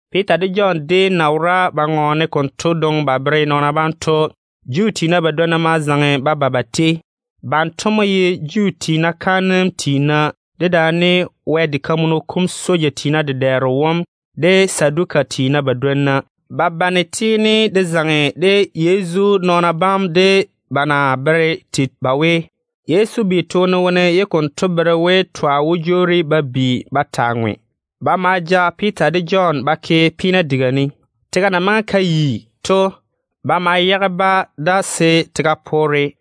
Piita de Jɔn déem na wora ba ŋɔɔne konto dwoŋi ba bere nɔɔna bam to, Juu tiina badwonna ma zaŋe ba ba ba tei. Banto mo ye Juu tiina kaanem tiina, dedaane Wɛ diga kam soja tiina dedɛɛro wom, de Saduka tiina badwonna. Ba bane tiini de zaŋe de Yezu nɔɔna bam de ba na bere tei ba we, Yezu bi toone wone ye konto bere we twa wó jwoori ba bi ba taa ŋwe. Ba ma ja Piita de Jɔn ba ke peena diga ne. Tega na maŋe ka yi to, ba ma yage-ba da se tega poore.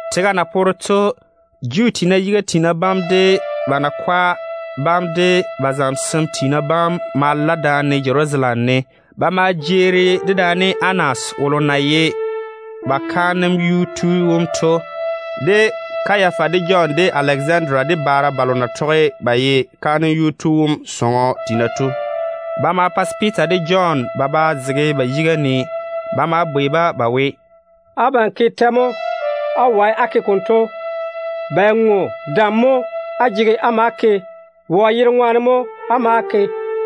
Tega na poore to, Juu tiina yiga tiina bam, de ba nakwa bam, de ba zamesem tiina bam ma la daane Jerusalem ne. Ba ma jeeri dedaane Anas wolo na ye ba kaanem yuu tu wom to, de Kayafa, de Jɔn, de Alezanda, de baara balo na tɔge ba ye kaanem yuu tu wom sɔŋɔ tiina to. Ba ma pa se Piita de Jɔn ba ba zege ba yiga ne. Ba ma bwei-ba ba we, “Abam ke tɛ mo á wae á ke konto? Bɛ ŋo dam mo á jege á ma á ke? Wɔ yere ŋwaane mo á ma á ke?”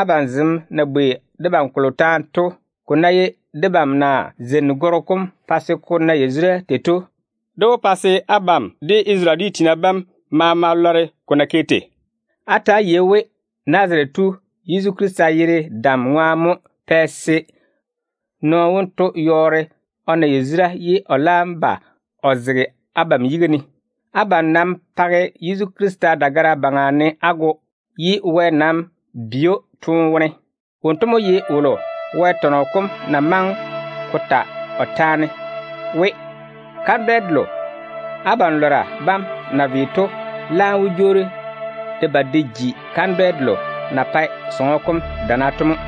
Abam zem na bwei debam kolo taane to, ko ná ye debam na zeini gɔrɔ kom pa se o na yazura tei to, dé wó pa se abam de Isarele dwi tiina bam maama lɔre ko na ke tei. Ta‑á yei-na we Nazarete tu Yezu Krista yere dem ŋwaane mo pɛ se nɔɔno wonto yɔɔre o na yazura ye o laam ba o zege abam yiga ne. Abam nam page Yezu Krista dagara yuu ne á go, ye Wɛ nam bi‑o toone wone. Wonto mo ye wolo Wɛ tɔnɔ kom na maŋe ko ta o taane we: ‘Kandwɛ delo abam lɔra bam na ve to laam mo jwoori de ba de ji kandwɛ delo na pae diga kam dana to mo.’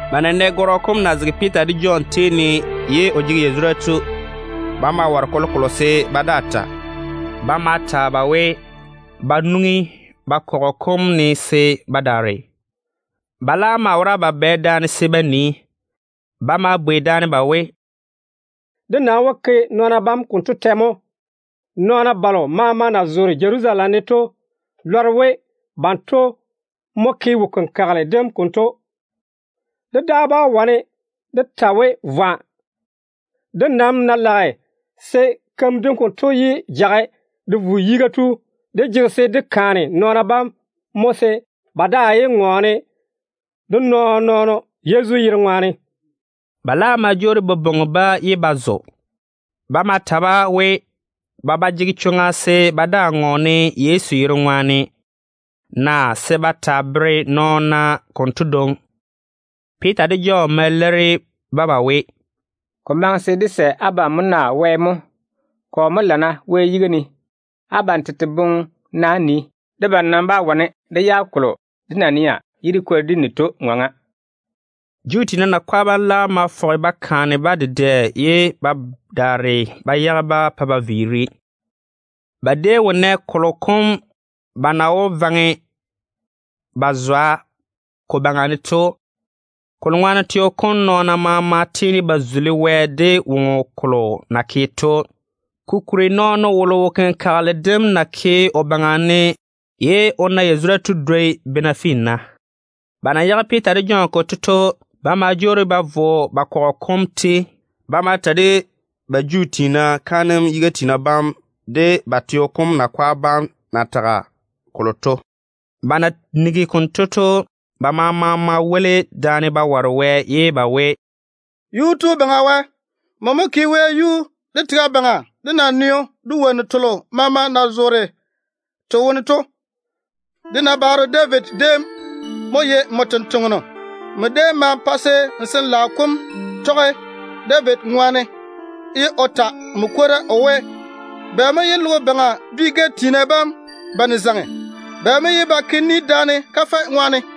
Ba na nɛ gɔrɔ kom na zege Piita de Jɔn tei ne ye o jege yazura to, ba maa ware kolokolo se ba daa ta. Ba ma ta-ba we, ba nwoŋi ba kɔgɔ kom ne se ba daare. Ba laam maa wora ba bane daane se ba nii. Ba ma bwei daane ba we, “Dé nam wó ke nɔɔna bam konto tɛ mo? Nɔɔna balo maama na zoore Jerusalem ne to lɔre we banto mo ke wo-kenkagele dem konto. Dé daa bá wane dé ta we, vwa. Dé nam na lage se keim dento yé jage de vo yiga to, dé jege se dé kaane nɔɔna bam mo se ba daa yé ŋɔɔne de nɔɔn-nɔɔno Yezu yere ŋwaane.” Ba laam ma jwoori ba bwoŋi-ba, ye ba zo. Ba ma ta-ba we, ba ba jege chwoŋa se ba daa tɔge Yezu yere ŋwaane ba ŋɔɔna, naa se ba taa bere nɔɔna konto dwoŋi. Piita de Jɔn ma leiri-ba ba we, “Ko maŋe se dé sɛ abam mo naa Wɛ mo? Kɔ mo lana Wɛ yiga ne? Abam tete boŋe-na á nii. Debam nam bá wane dé yage kolo dé na nɛ ye dé kwori dé ni to ŋɔŋa.” Juu tiina nakwa bam laam ma fɔge ba kaane-ba dedɛ ye ba daare ba yage-ba pa ba viiri. Ba déem wo nɛ kolo kom ba na wó vaŋe ba zwa ko baŋa ne to, kolo ŋwaane teo kom nɔɔna maama tiini ba tei Wɛ de woŋo kolo na ke to. Kokuri nɔɔno wolo wo-kenkagele dem na ke o baŋa ne ye o na yazura to dwoi bena finna. Ba maa na yage Piita de Jɔn konto to, ba ma jwoori ba vo ba kɔgɔ kom tei. Ba ma ta de-ba Juu tiina kaanem yiga tiina bam de ba teo kom nakwa bam na tage kolo to. Ba na nigi konto to, ba maama ma woli daane ba ware Wɛ ye ba we, “Yuu-tu Baŋa Wɛ, nmo mo ke wɛyuu, de tega baŋa, de naneo, de wonnu telo maama na zoore te wone to. Dé nabaaro David déem mo ye nmo tontoŋeno. Nmo déem ma pa se n Sin-laao kom tɔge David ŋwaane ye o ta nmo kwora o we: ‘Bɛ mo ye logo baŋa dwi-gɛ tiina bam bane zaŋe? Bɛ mo ye ba ke daane ba boŋe boboŋa kafɛ ŋwaane?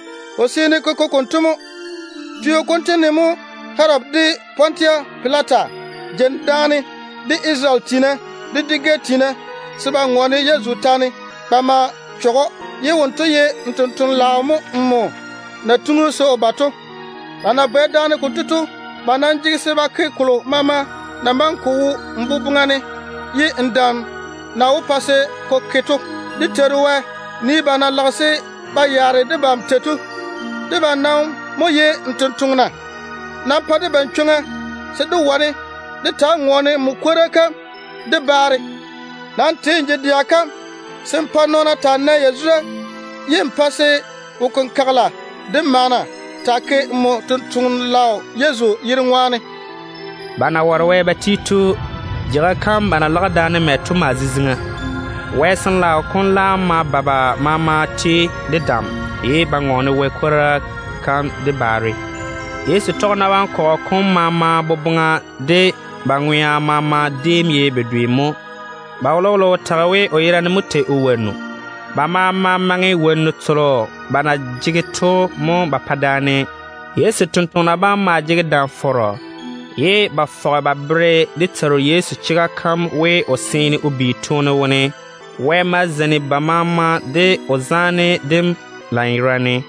Ko seene ko ke konto mo. Teo konto ne mo Herodi de Pontusi Pilata jeini daane de Isarele dwi tiina, de dwi-gɛ tiina, se ba ŋɔɔne Yezu taane ba ma chɔge‑o, ye wonto ye n tontoŋeno-laao nmo na tiŋi‑o se o ba to. Ba na bane daane konto to, ba nam jege se ba ke kolo maama na maŋe ko wo n boboŋa ne ye n dam na wó pa se ko ke to. Dé Teiru Wɛ, nii ba na lage ba yaare debam tei to! Debam nam mo ye n tontoŋena. Nam pa debam chwoŋa se dé wane dé taa ŋɔɔne nmo kwora kam de baare. Nam twe n je-dɛa kam se n pa nɔɔna taa nae yazura, ye n pa se wo-kenkagela de maana taa ke nmo tontoŋeno-laao Yezu yere ŋwaane.” Ba na ware Wɛ ba ti to, jeiga kam ba na lage daane mɛ to maa ziziŋa. Wɛ Sin-laao kom laam ma ba ba maama tei de dam, ye ba ŋɔɔne Wɛ kwora kam de baare. Yezu tɔgena bam kɔgɔ kom maama boboŋa de ba ŋwea maama déem ye bedwe mo. Ba wolowolo wo tage we, o yerane mo tei o wonnu. Ba maama maŋe wonnu telo ba na jege to mo ba pa daane. Yezu totoŋa nakwa bam maa jege dam-fɔrɔ, ye ba fɔge ba bere dé Teiru Yezu chega kam we o seene o bi toone wone. Wɛ ma zeini ba maama de o zaane dem lanyerane.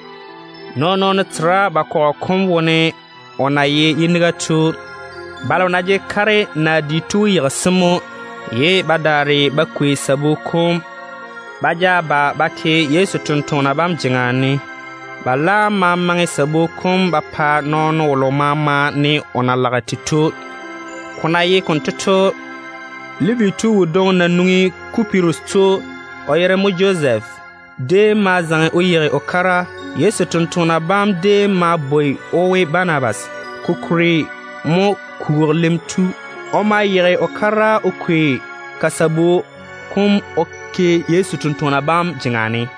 Nɔɔn-nɔɔno tera ba kɔgɔ kom wone o na ye yiniga tu. Balo na jege kare naa di to wó yeigi-se mo, ye ba daare ba kwei sabu kom ba ja ba ba ke Yezu totoŋa nakwa bam jeŋa ne. Ba laam ma maŋe sabu kom ba pa nɔɔno wolo maama ne o na lage tei to. Ko na ye konto to, Levi tu wodwoŋi na nwoŋi Kupirus to, o yere mo Josef, déem ma zaŋe o yeigi o kara. Yezu totoŋa nakwa bam déem maa bwoi‑o we Banabas, ko kuri mo kwogilim tu. O ma yeigi o kara o kwei ka sabu kom o ke Yezu totoŋa nakwa bam jeŋa ne.